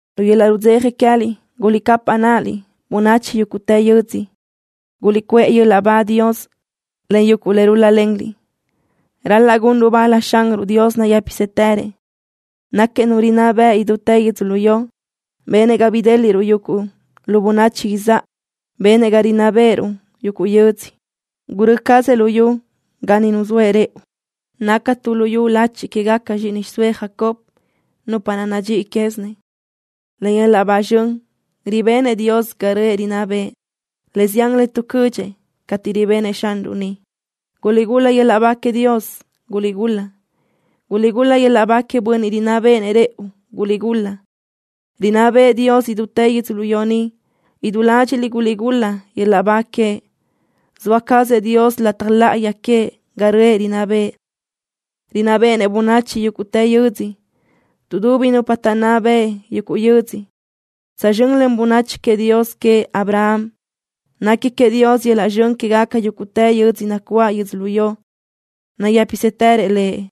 ¡Lu yöl-laʼ rudzeja queë́liʼ guliʼcapaʼ náʼaliʼ, bönachi yúguʼtë yödzö! ¡Guliʼcuʼë yöl-laʼ ba Dios, len yuguʼ le rúl-lalenliʼ! Ral-laʼ gunruʼ bal Xanruʼ Dios nayë́pisëtërëʼ. Náquiëʼ Nu rinná bëʼ idútë yödzölió. Benëʼ ga bidéliʼruʼ yuguʼ lu bönachi izáʼa. Benëʼ ga rinná beʼeruʼ yuguʼ yödzö. Gurö́ cazëʼ luyú ga ni nuzóëʼ rëʼu. Naca tu luyú lachi quégaca zxíʼini xiʼsóëʼ Jacob, nupa naʼ nadxíʼi quézinëʼ. Len yöl-laʼ ba zxön ribenëʼ Dios ga röʼë rinná bëʼë. Le zián le tuʼcödxëʼ cateʼ ribenëʼ Xanruʼ niʼ. ¡Guliʼgul-la yöl-laʼ ba queëʼ Dios! ¡Guliʼgul-la! ¡Guliʼgul-la yöl-laʼ ba queëʼ Bönniʼ rinná béʼenëʼ rëʼu! ¡Guliʼgul-la! ¡Rinná bëʼë Dios idútë yödzölió ni! ¡Idú ládxiʼliʼ guliʼgul-la yöl-laʼ ba queëʼ! ¡Zoa cazëʼ Dios lataj láʼayi queëʼ ga röʼë rinná bëʼë! ¡Rinná béʼenëʼ bönachi yúguʼtë yödzö! Tuʼdubi nupa taʼnná beʼe yuguʼ yödzö tsözxö́n len bönachi queëʼ Dios queëʼ Abraham. ¡Nequi queëʼ Dios yöl-laʼ zxön quégaca yúguʼtë yödzö nacuáʼ yödzölió! ¡Nayë́pisëtërëʼ Lëʼ!